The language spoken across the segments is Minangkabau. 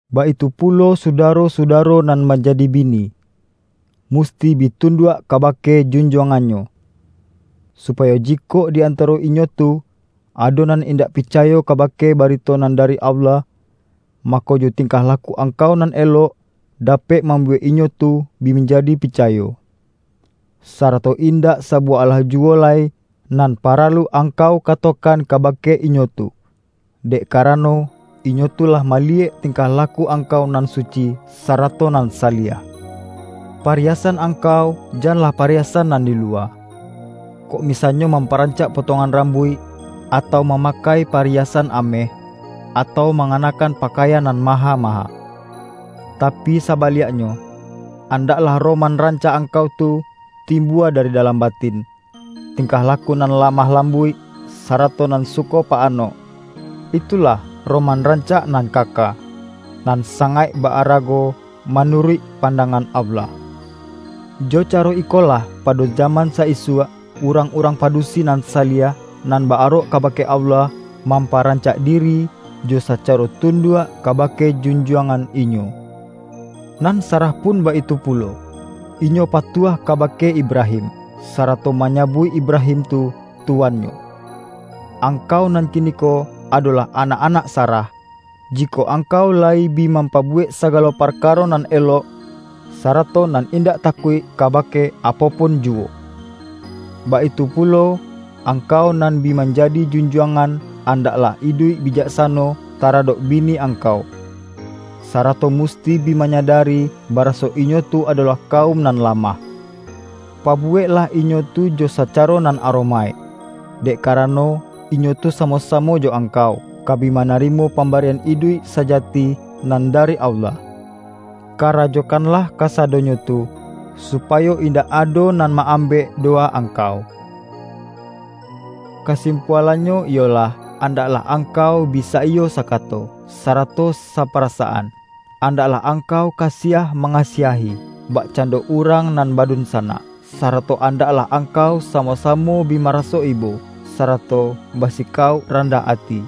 Baitu pulo sudaro-sudaro nan manjadi bini, musti bi tunduak kabake junjuangannyo, supayo jikok di antaro inyo tu, ado nan indak pica-yo kabake barito nan dari Allah, ma-ko, jo tingkah laku angkau nan elok, dapek mambuwek inyo tu bi manjadi picayo. Sarato indak sabuwah alah ju-wo lai nan paralu angkau katokan ka-bake inyo tu, dek karano, inyo tu lah maliyek tingkah laku angkau nan suci sarato nan saliah. Pariyasan angkau janlah pariyasan nan di luwa, kok mi-sanyo mamparancak potongan ram-buik, atau mamakai pariyasan ameh, atau manganakkan pakaian nan ma-ha-maha. Tapi sabaliaknyo, andak-lah roman rancak angkau tu timbua dari dalam batin, tingkah laku nan lamah lambuik, sarato nan suko pa-anok; itulah roman rancak nan kaka, nan sangaik ba-arago manuruik pan-dangan Allah. Jo caro ikolah pado jaman sa-isuak, urang-urang padusi nan saliah, nan ba-arok kabake Allah, mamparancak diri jo sacaro tunduak kabake junjuangan inyo. Nan Sarah pun baitu pulo, inyo patuah kabake Ibrahim, sarato manyabuik Ibrahim tu, tuannyo. Angkau nan kiniko, ado-lah anak-anak Sarah, jikok angkau layi bi mampabuwek sagalo parkaro nan elok, sarato nan indak takuik ka-bake apo pun juwo. Baitu pulo, angkau nan bi manjadi junjuangan, andaklah iduik bijaksano taradok bini angkau, sarato musti bi manyadari, baraso inyo tu adolah ka-um nan lamah. Pabuweklah inyo tu jo sacaro nan aromaik, dek karano, inyo tu samo-samo jo angkau, ka bi mana-rimo pambarian iduik sajati nan da-ri Allah. Karajokanlah kasadonyo tu, supayo indak ado nan ma-ambek do-wa angkau. Kasimpualannyo iyolah: andaklah angkau bi saiyo sakato, sarato sapa-rasaan. Andaklah angkau kasiah ma-ngasiahi, bakcando urang nan ba-dunsanak. Sarato andaklah angkau samo-samo bi maraso ibo, sarato ba-sikauk randah ati.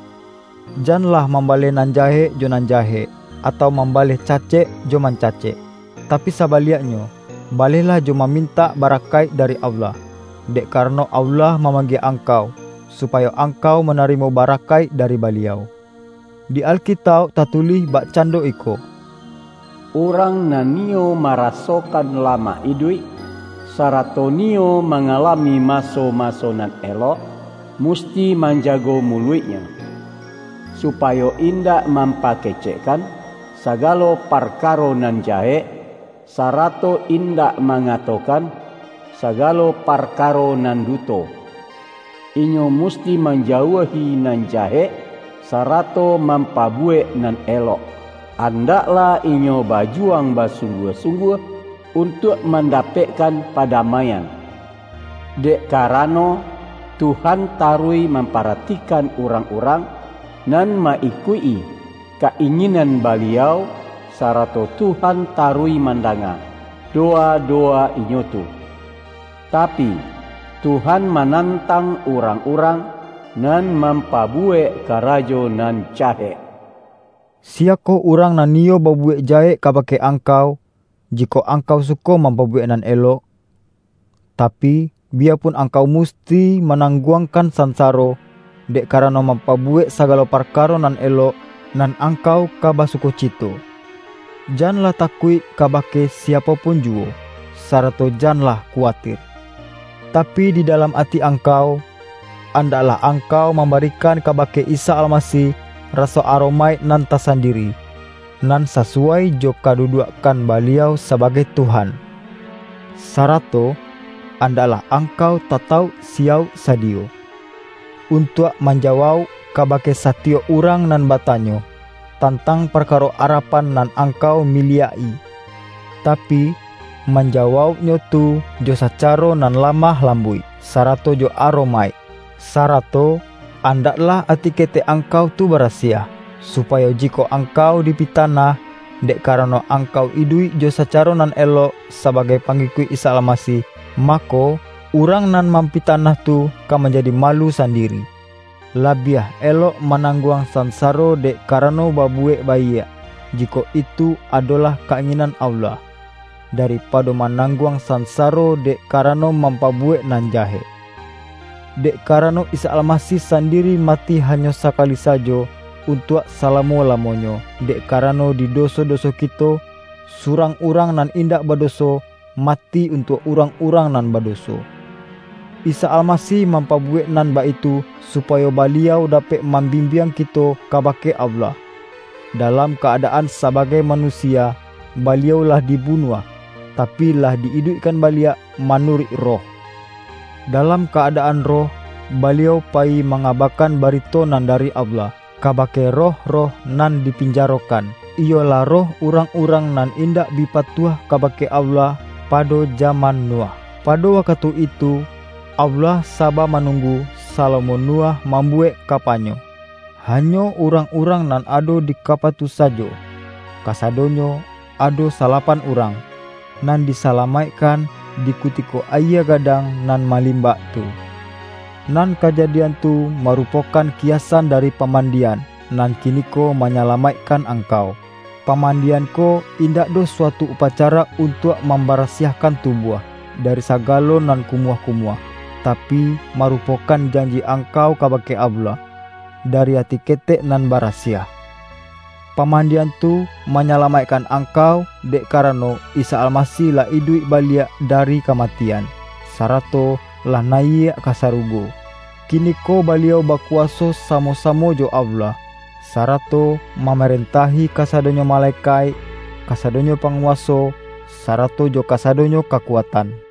Janlah mambaleh nan jahek jo nan jahek, atau mam-baleh cacek jo mancacek; tapi saba-liaknyo, balehlah jo mamintak ba-rakaik dari Allah. Dek karano, Allah mamanggie angkau, supayo ang-kau manarimo barakaik dari Baliau. Di Alkitauk tatulih bakcando iko,”Urang nan niyo marasokan lamak iduik, sarato niyo mangalami maso-maso nan elok, musti manjago muluiknyo, supayo indak mampakecekkan sagalo parkaro nan jahek, sarato indak mangatokan sagalo parkaro nan duto. Inyo musti manjauahi nan jahek, sarato mampabuwek nan elok; andaklah inyo bajuwang ba-sungguah-sungguah, untuak mandapekkan padamaian. Dek karano, Tuhan taruih mamparatikan urang-urang nan ma-ikuik-i ka-inginan Baliau, sarato Tuhan taruih mandanga dowa-dowa inyo tu; tapi, Tuhan manantang urang-urang nan mampabuwek karajo nan jahek.” Siyakoh urang nan niyo babu-wek jahek kabake angkau, jikok ang-kau suko mampabuwek nan elok? Tapi, biyapun angkau musti ma-nangguangkan sansaro, dek kara-no mampabuwek sagalo parkaro nan elok, nan angkau ka basukoci-to! Janlah takuik kabake siapo pun juwo, sarato janlah kuwatir. Tapi, di dalam ati angkau, andaklah ang-kau mambarikan kabake Isa Almasih raso aromaik nan tasandiri, nan sa-suwai jo kaduduakkan Baliau saba-gai Tuhan. Sarato andaklah angkau tatauk siyauk sadiyo, untuak manja-wauk kabake satiyok urang nan bata-nyo, tantang parkaro arapan nan ang-kau miliak-i. Tapi, manjawauknyo tu jo sacaro nan lamah lambuik, sara-to jo aromaik. Sarato andaklah ati ke-tek angkau tu barasiah, supayo jikok angkau dipitanah, dek karano ang-kau iduik jo sacaro nan elok sabagai pangikuik Isa Almasih, mako, urang nan mampitanah tu ka manjadi malu sandiri. Labiah elok manangguang sansaro dek karano babuwek baiak — jikok itu adolah ka-inginan Allah — da-ripado manangguang sansaro dek ka-rano mampabuwek nan jahek. Dek karano, Isa Almasih sandiri mati ha-nyo sakali sajo, untuak salamo-lamo-nyo, dek karano di doso-doso kito — Surang Urang nan indak badoso, mati untuak urang-urang nan badoso. Isa Almasih mampabuwek nan baitu, su-payo Baliau dapek mambimbiang ki-to kabake Allah. Dalam ka-adaan sa-bagai manusia Baliau lah dibunuah, tapi, lah di-iduikkan baliak manu-ruik Roh. Dalam ka-adaan Roh, Ba-liau payi mangabakan barito nan dari Allah, kabake roh-roh nan dipinjaro-kan: iyolah roh urang-urang nan indak bi patuah kabake Allah, pado jaman Nuh. Pado wakatu itu, Allah saba manunggu, salamo Nuh mam-buwek kapanyo. Hanyo urang-urang nan ado di kapa tu sajo — kasadonyo ado salapan urang — nan disalamaik-kan di kutiko ayie gadang nan malim-bak tu. Nan kajadian tu marupokan kiyasan dari pamandian, nan kiniko manyalamaikkan angkau. Pamandian ko indak doh suatu upacara untuak mambarasiahkan tubuah, dari saga-lo nan kumuah-kumuah, tapi, maru-pokan janji angkau kabake Allah, da-ri ati ketek nan barasiah. Pamandian tu manyalamaikkan angkau, dek ka-rano, Isa Almasih lah iduik baliak da-ri kamatian, sarato lah nayiak ka sarugo. Kiniko Baliau bakuwaso sa-mo-samo jo Allah, sarato mamaren-tahi kasadonyo malekaik, kasadonyo panguwaso, sarato jo kasadonyo ka-kuatan.